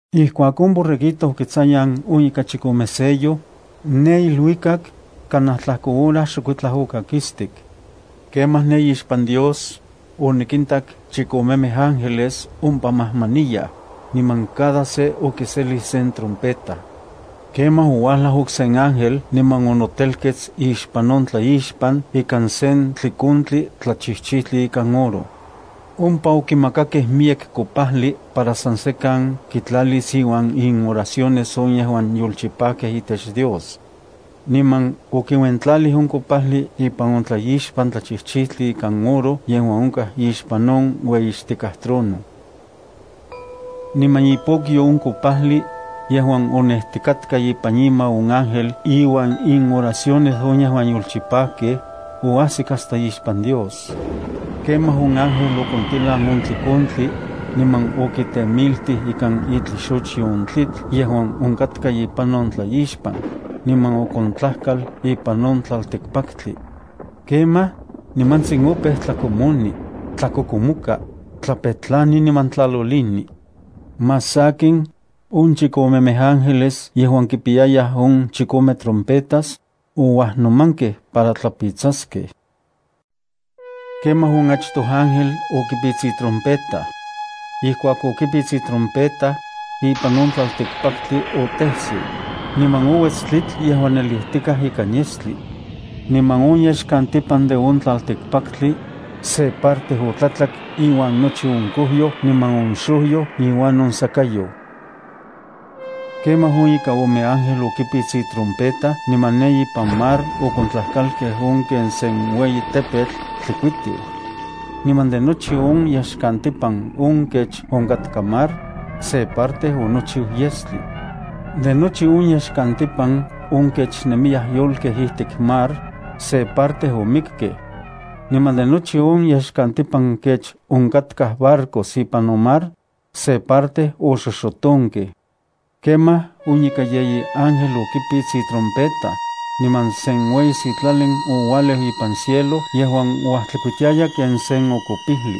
Ijkuak on Borreguito okitsayan on ika chikome sello, ne iluikak kanaj tlajko hora xokuitlaj okakistik. Kemaj ne ixpan Dios, onikintak chikomemej ángeles ompa majmaniyaj, niman cada se okiselij sen trompeta. Kemaj ouajlaj okse ángel niman onotelkets ixpan on tlaixpan ikan sen tlikontli tlachijchijtli ikan oro. Ompa okimakakej miyek kopajli para san sekan kitlalis iuan inoraciones on yejuan yolchipajkej itech Dios. Niman okiuentlalij on kopajli ipan on tlaixpan tlachijchijtli ikan oro yejuan onkaj ixpan on ueyixtikaj trono. Niman ipokyo on kopajli, yejuan onejtikatka ipan ima on ángel iuan inoraciones on yejuan yolchipajkej, oajsik hasta ixpan Dios. Kemaj on ángel okontilan on tlikontli, niman okitemiltij ikan itlixochyo on tlitl yejuan onkatka ipan on tlaixpan, niman okontlajkal ipan on tlaltikpaktli. Kemaj, nimantsin opeu tlakomoni, tlakokomoka, tlapetlani niman tlalolini. Más sakin, on chikomemej ángeles yejuan kipiyayaj on chikome trompetas, ouajnomankej para tlapitsaskej. Kemaj on achtoj ángel okipits itrompeta. Ijkuak okipits itrompeta, ipan on tlaltikpaktli otejsiu, niman ouets tlitl yejuan nelijtikaj ikan yestli. Niman on yexkantipan de on tlaltikpaktli, se parte otlatlak iuan nochi on kojyoj niman on xojyoj iuan on sakayoj. Kemaj on ika ome ángel okipits itrompeta niman ne ipan mar okontlajkalkej on ken sen ueyi tepetl tlikuitiu. Niman de nochi on yexkantipan on kech onkatka mar, se parte onochiu yestli. De nochi on yexkantipan on kech nemiyaj yolkej ijtik mar, se parte omikkej. Niman de nochi on yexkantipan kech onkatkaj barcos ipan on mar, se parte oxoxotonkej. Kemaj on ika yeyi ángel okipits itrompeta, niman sen ueyi sitlalin oualeu ipan cielo yejuan uajtlikuitiaya ken sen okopijli.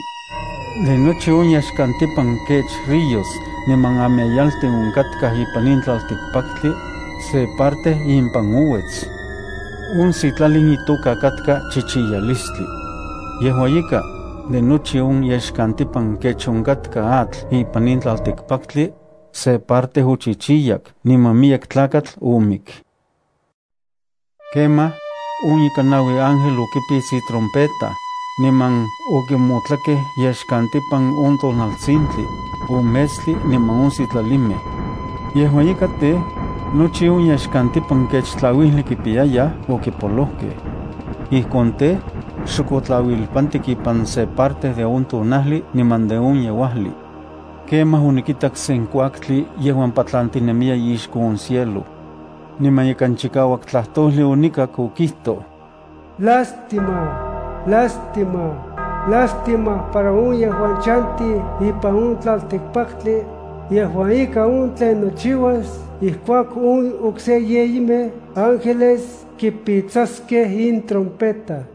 De nochi on yexkantipan kech ríos niman ameyaltin onkatkaj ipan in tlaltikpaktli, se parte impan ouets. On sitlalin itoka katka chichiyalistli. Yejua ika, de nochi on yexkantipan kech onkatka atl ipan in tlaltikpaktli, se parte ochichiyak niman miyek tlakatl omik. Kemaj, on ika naui ángel okipits itrompeta, niman okimotlakej yexkantipan on tonaltisintli, on metstli niman on sitlalimej. Yejua ika tej, nochi on yexkantipan kech tlauijli kipiyayaj okipolojkej. Ijkon tej, xok otlauilpantik ipan se parte de on tonajli niman de on yeuajli. Kemaj onikitak sen kuaktli yejuan patlantinemiya ixko on cielo. Niman ikan chikauak tlajtojli onikak okijtoj: “¡Lástima, lástima, lástima para on yejuan chantij ipan on tlaltikpaktli, yejua ika on tlen nochiuas ijkuak on okse yeyimej ángeles kipitsaskej intrompeta!”